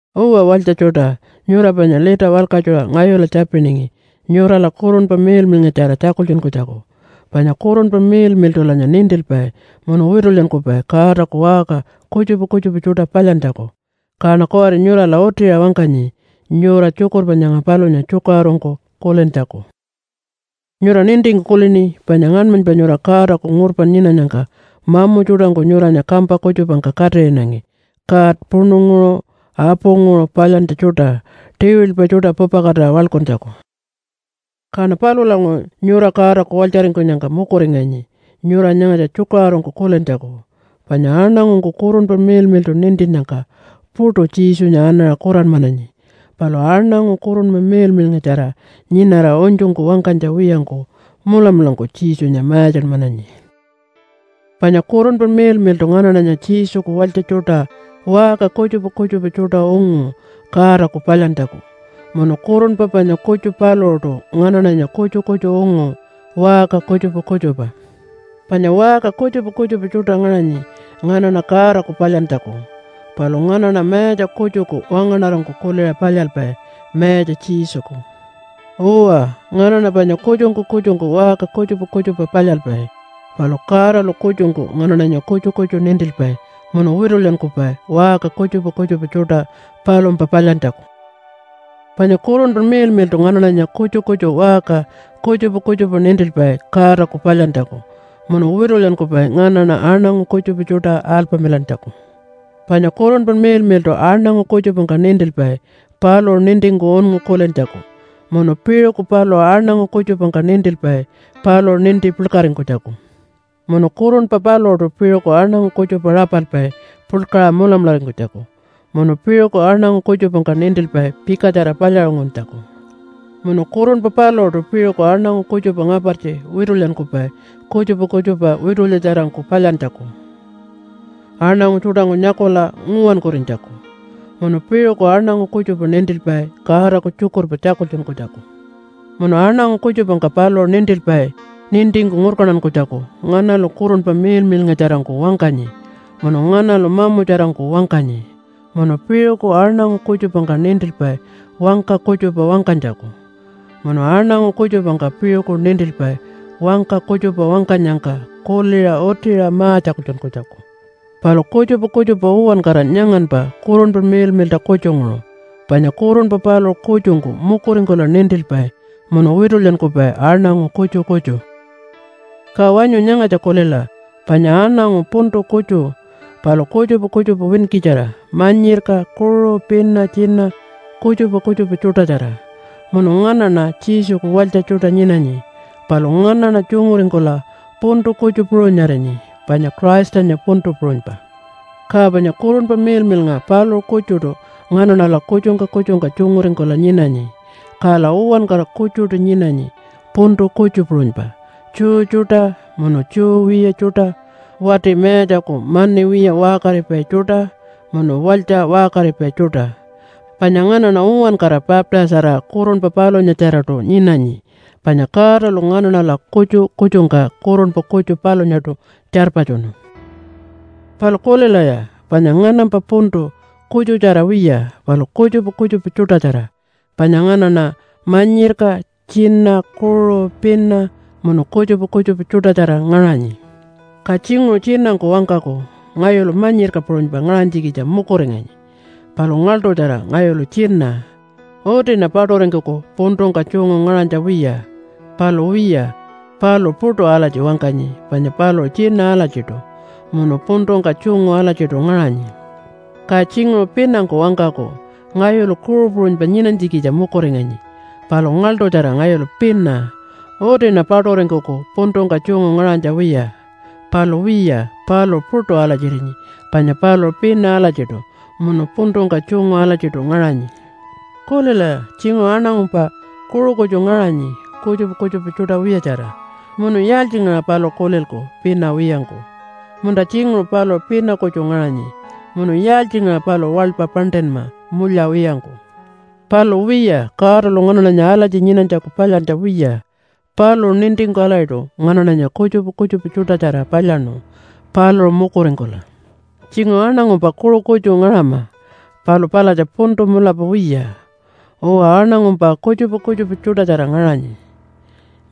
Uwa walytja tjuṯa, nyura panya lita walkatjuṟa ngayula tjapiningi nyurala Kurunpa Miḻmiḻngatjara tjakultjunkunytjaku, panya Kurunpa Miḻmiḻṯulanya nintilpai munu witulyankupai Godaku waṟka kutjupa kutjupa tjuṯa palyantjaku. Kaṉa kuwari nyurala utiṟa wangkanyi nyura tjukurpa nyanga palunya tjukaṟurungku kulintjaku. Nyura nintingku kulini panya ngaṉmanypa nyura Godaku ngurpa nyinanyangka mamu tjuṯangku nyuranya kampa kutjupangka katiṟinangi god puṉunguṟu apunguṟu palyantja tjuṯa tiwilpa tjuṯa pupakatira waḻkuntjaku. Kaṉa palulanguṟu nyura Godaku walytjaringkunyangka mukuringanyi nyura nyangatja tjukaṟurungku kulintjaku. Panya aṉangungku Kurunpa Miḻmiḻṯu nintinnyangka puṯu Jesunya anaṟa kuranmananyi. Palu aṉangu Kurunpa Miḻmiḻngatjara nyinara unytjungku wangkanytja wiyangku mulamulangku Jesunya mayatjanmananyi. Panya Kurunpa Miḻmiḻṯu nganaṉanya Jesuku walytja tjuṯa waṟka kutjupa kutjupa tjuṯa ungu Godaku palyantjaku. Munu Kurunpa panya kutju paluṟuṯu nganaṉanya kutju kutju ungu waṟka kutjupa kutjupa. Panya waṟka kutjupa kutjupa tjuṯa ngaṟanyi nganaṉa Godaku palyantjaku, palu nganaṉa Mayatja kutjuku wangaṉarangku kuliṟa palyalpai, Mayatja Jesuku. Uwa, nganaṉa panya kutju-kutjungku waṟka kutjupa kutjupa palyalpai, palu Godalu kutjungku nganaṉanya kutju kutju nintilpai munu witulyankupai waṟka kutjupa kutjupa tjuṯa palumpa palyantjaku. Panya Kurunpa Miḻmiḻṯu nganaṉanya kutju kutju waṟka kutjupa kutjupa nintilpai Godaku palyantjaku, munu witulyankupai nganaṉa aṉangu kutjupa tjuṯa alpamilantjaku. Panya Kurunpa Miḻmiḻṯu aṉangu kutjupangka nintilpai paluṟu nintingku unngu kulintjaku, munu piṟuku paluṟu aṉangu kutjupangka nintilpai paluṟu ninti puḻkaringkunytjaku. Munu Kurunpa paluṟuṯu piṟuku aṉangu kutjupa rapalpai puḻkaṟa mulamularingkunytjaku, munu piṟuku aṉangu kutjupangka nintilpai pikatjara palyaṟunguntjaku. Munu Kurunpa paluṟuṯu piṟuku aṉangu kutjupa ngapartji witulyankupai kutjupa kutjupa witulyatjarangku palyantjaku aṉangu tjuṯangku nyakula nguwankurinytjaku. Munu piṟuku aṉangu kutjupa nintilpai Godaku tjukurpa tjakultjunkunytjaku. Munu aṉangu kutjupangka paluṟu nintilpai nintingku ngurkantankunytjaku nganalu Kurunpa Miḻmiḻngatjarangku wangkanyi, munu nganalu mamutjarangku wangkanyi. Munu piṟuku aṉangu kutjupangka nintilpai wangka kutjupa wangkanytjaku. Munu aṉangu kutjupangka piṟuku nintilpai wangka kutjupa wangkanyangka kuliṟa utiṟa ma-tjakultjunkunytjaku. Palu kutjupa kutjupa uwankara nyanganpa Kurunpa Miḻmiḻṯa kutjunguṟu, panya Kurunpa paluṟu kutjungku mukuringkula nintilpai munu witulyankupai aṉangu kutju kutju. Ka wanyu nyangatja kulila, panya aṉangu puntu kutju, palu kutjupa kutjupa winkitjara manyirka, kuṟu, pina, tjina, kutjupa kutjupa tjuṯatjara. Munu nganaṉa Jesuku walytja tjuṯa nyinanyi, palu nganaṉa tjunguringkula puntu kutju puṟunyarinyi, panya Christanya puntu puṟunypa. Ka panya Kurunpa Miḻmiḻnga paluṟu kutjuṯu nganaṉala kutjungka kutjungka tjunguringkula nyinanyi, kala uwankara kutjuṯu nyinanyi puntu kutju puṟunypa, Jew tjuṯa, munu Jew wiya tjuṯa, wati mayatjaku mani wiya waṟkaripai tjuṯa, munu walytja waṟkaripai tjuṯa. Panya nganaṉa uwankara baptise-arira Kurunpa palunyatjaraṯu nyinanyi, panya Godalu nganaṉala kutju kutjungka Kurunpa kutju palunyaṯu tjarpatjunu. Palu kulilaya, panya nganampa puntu kutjutjara wiya palu kutjupa kutjupa tjuṯatjara, panya nganaṉa manyirka, tjina, kuṟu, pina, munu kutjupa kutjupa tjuṯatjara ngaṟanyi. Ka tjinguṟu tjinangku wangkaku, “Ngayulu manyirka puṟunypa ngaṟanytjikitja mukuringanyi. Palu ngaḻṯutjara ngayulu tjina. Utiṉa paṯuringkuku puntungka tjungu ngaṟanytja wiya.” Palu wiya, paluṟu puṯu alatji wangkanyi panya paluṟu tjina alatjiṯu munu puntungka tjungu alatjiṯu ngaṟanyi. Ka tjinguṟu pinangku wangkaku, “Ngayulu kuṟu puṟunypa nyinanytjikitja mukuringanyi. Palu ngaḻṯutjara ngayulu pina. Utiṉa paṯuringkuku puntungka tjungu ngaṟanytja wiya.” Palu wiya paluṟu puṯu alatjirinyi panya paluṟu pina alatjiṯu munu puntungka tjungu alatjiṯu ngaṟanyi. Kulilaya, tjinguṟu aṉangumpa kuṟu kutju ngaṟanyi kutjupa kutjupa tjuṯa wiyatjara, munu yaaltjingaṟa paluṟu kulilku pina wiyangku? Munta tjinguṟu paluṟu pina kutju ngaṟanyi, munu yaaltjingaṟa paluṟu waḻpa paṉṯinma mulya wiyangku? Palu wiya, Godalu nganaṉanya alatji nyinanytjaku palyantja wiya. Paluṟu nintingku alatjiṯu nganaṉanya kutjupa kutjupa tjuṯatjara palyaṉu paluṟu mukuringkula. Tjinguṟu aṉangumpa kuṟu kutju ngaṟama, palu palatja puntu mulapa wiya. Uwa, aṉangumpa kutjupa kutjupa tjuṯatjara ngaṟanyi,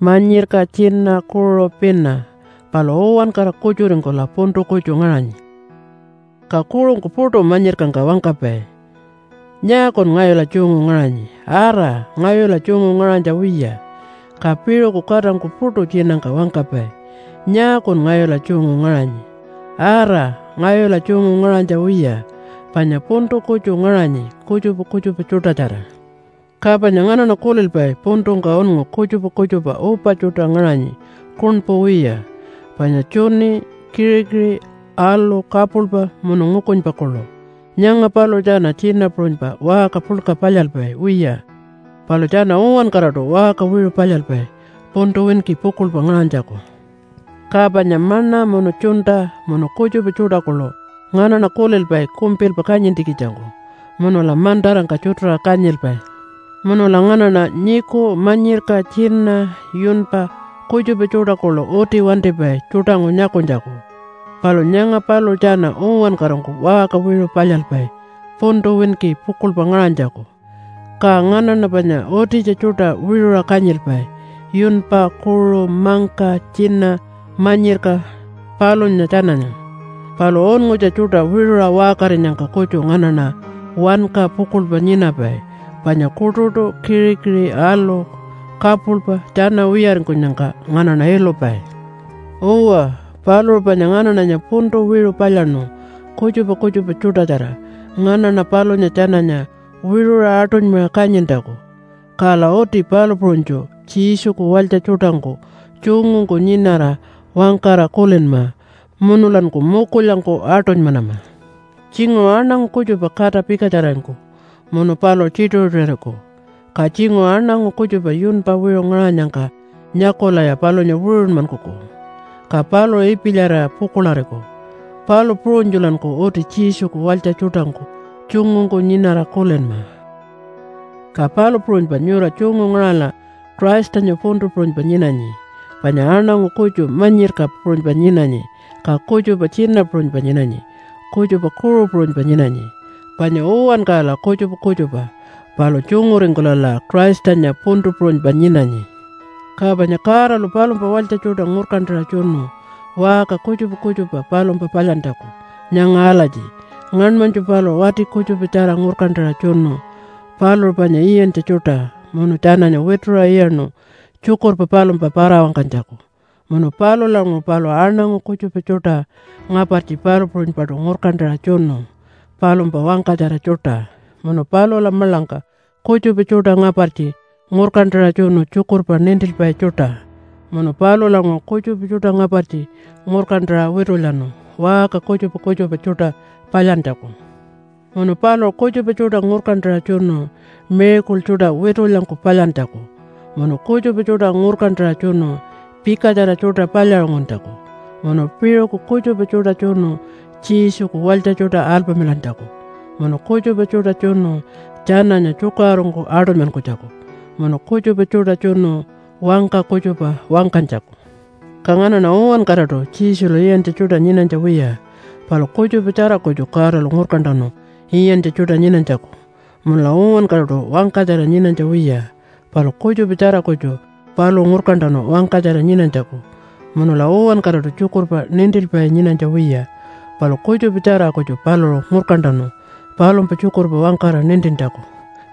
manyirka, tjina, kuṟu, pina, palu uwankara kutjuringkula puntu kutju ngaṟanyi. Ka kuṟungku puṯu manyirkangka wangkapai, “Nyaakun ngayula tjungu ngaṟanyi? Ara, ngayula tjungu ngaṟanytja wiya.” Ka piṟuku katangku puṯu tjinangka wangkapai, “Nyaakun ngayula tjungu ngaṟanyi? Ara, ngayula tjungu ngaṟanytja wiya.” Panya puntu kutju ngaṟanyi, kutjupa kutjupa tjuṯatjara. Ka panya nganaṉa kulilpai puntungka unngu kutjupa kutjupa upa tjuṯa ngaṟanyi kuṉpu wiya panya tjuni, kiṟikiṟi, alu, kapuḻpa, munu ngukunypa kuḻu. Nyanga paluṟu tjana tjina puṟunypa waṟka puḻka palyalpai wiya, palu tjana uwankaraṯu waṟka wiṟu palyalpai puntu winki pukuḻpa ngaṟanytjaku. Ka panya maṉa munu tjunta munu kutjupa tjuṯa kuḻu nganaṉa kulilpai kumpilpa kanyintjikitjangku munula mantarangka tjutuṟa kanyilpai. Munula nganaṉa nyiku, manyirka, tjina, yunpa kutjupa tjuṯa kuḻu uti wantipai tjuṯangku nyakunytjaku. Palu nyanga paluṟu tjana uwankarangku waṟka wiṟu palyalpai puntu winki pukuḻpa ngaṟanytjaku. Ka nganaṉa panya utitja tjuṯa wiṟuṟa kanyilpai, yunpa, kuṟu, mangka, tjina, manyirka palunya tjananya, palu unngutja tjuṯa wiṟuṟa waṟkarinyangka kutju nganaṉa wanka pukuḻpa nyinapai, panya kuṯuṯu, kiṟikiṟi, alu, kapuḻpa tjana wiyaringkunyangka nganaṉa ilupai. Uwa, paluṟu panya nganaṉanya puntu wiṟu palyaṉu kutjupa kutjupa tjuṯatjara nganaṉa palunya tjananya wiṟuṟa aṯunymaṟa kanyintjaku. Kala uti palu puṟunytju Jesuku walytja tjuṯangku tjungungku nyinara wangkara kulinma, munulanku mukulyangku aṯunymanama. Tjinguṟu aṉangu kutjupa kata pikatjararingkuku munu paluṟu tjituṟu-tjituṟuriku. Ka tjinguṟu aṉangu kutjupa yunpa wiṟu ngaṟanyangka nyakulaya palunya wiṟunmankuku, ka paluṟu ipilyarira pukuḻariku. Palu puṟunytjulanku uti Jesuku walytja tjuṯangku tjungungku nyinara kulinma. Ka palu puṟunypa nyura tjungu ngaṟala Christanya puntu puṟunypa nyinanyi. Panya aṉangu kutju manyirka puṟunypa nyinanyi, ka kutjupa tjina puṟunypa nyinanyi, kutjupa kuṟu puṟunypa nyinanyi. Panya uwankarala kutjupa kutjupa, palu tjunguringkulala Christanya puntu puṟunypa nyinanyi. Ka panya Godalu palumpa walytja tjuṯa ngurkantaṟa tjunu waṟka kutjupa kutjupa palumpa palyantjaku, nyanga alatji ngaṉmanytju paluṟu wati kutjupatjara ngurkantaṟa tjunu paluṟu panya iyantja tjuṯa munu tjananya wituṟa iyaṉu tjukurpa palumpa para-wangkanytjaku. Munu palulanguṟu paluṟu aṉangu kutjupa tjuṯa ngapartji palu puṟunypaṯu ngurkantaṟa tjunu palumpa wangkatjara tjuṯa, munu palula maḻangka kutjupa tjuṯa ngapartji ngurkantaṟa tjunu tjukurpa nintilpai tjuṯa. Munu palulanguṟu kutjupa tjuṯa ngapartji ngurkantaṟa witulyanu waṟka kutjupa kutjupa tjuṯa palyantjaku. Munu paluṟu kutjupa tjuṯa ngurkantaṟa tjunu miracle tjuṯa witulyangku palyantjaku, munu kutjupa tjuṯa ngurkantaṟa tjunu pikatjara tjuṯa palyaṟunguntjaku, munu piṟuku kutjupa tjuṯa tjunu Jesuku walytja tjuṯa alpamilantjaku, munu kutjupa tjuṯa tjunu tjananya tjukaṟurungku aṯunymankunytjaku, munu kutjupa tjuṯa tjunu wangka kutjupa wangkanytjaku. Ka nganaṉa uwankaraṯu Jesulu iyantja tjuṯa nyinanytja wiya, palu kutjupatjara kutju Godalu ngurkantanu iyantja tjuṯa nyinanytjaku. Munula uwankaraṯu wangkatjara nyinanytja wiya, palu kutjupatjara kutju paluṟu ngurkantanu wangkatjara nyinanytjaku. Munula uwankaraṯu tjukurpa nintilpai nyinanytja wiya, palu kutjupatjara kutju paluṟu ngurkantanu palumpa tjukurpa wangkara nintintjaku.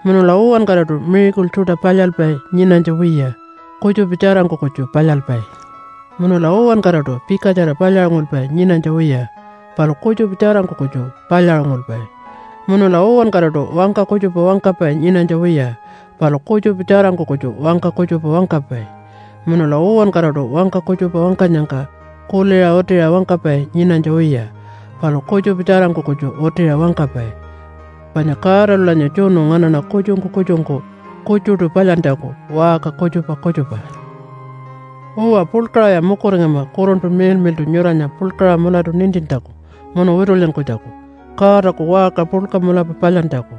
Munula uwankaraṯu miracle tjuṯa palyalpai nyinanytja wiya, kutjupa tjarangku kutju palyalpai. Munula uwankaraṯu pikatjara palyaṟungulpai nyinanytja wiya, palu kutjupa tjarangku kutju palyaṟungulpai. Munula uwankaraṯu wangka kutjupa wangkapai nyinanytja wiya, palu kutjupa tjarangku kutju wangka kutjupa wangkapai. Munula uwankaraṯu wangka kutjupa wangkanyangka kuliṟa utiṟa wangkapai nyinanytja wiya, palu kutjupa tjarangku kutju utiṟa wangkapai. Panya Godalulanya tjunu nganaṉa kutjungku kutjungku kutjuṯu palyantjaku waṟka kutjupa kutjupa. Uwa, puḻkaṟaya mukuringama Kurunpa Miḻmiḻṯu nyuranya puḻkaṟa mulatu nintintjaku munu witulyankunytjaku Godaku waṟka puḻka mulapa palyantjaku.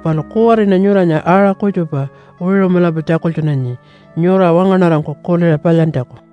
Palu kuwariṉa nyuranya aṟa kutjupa wiṟu mulapa tjakultjunanyi nyura wangaṉarangku kuliṟa palyantjaku.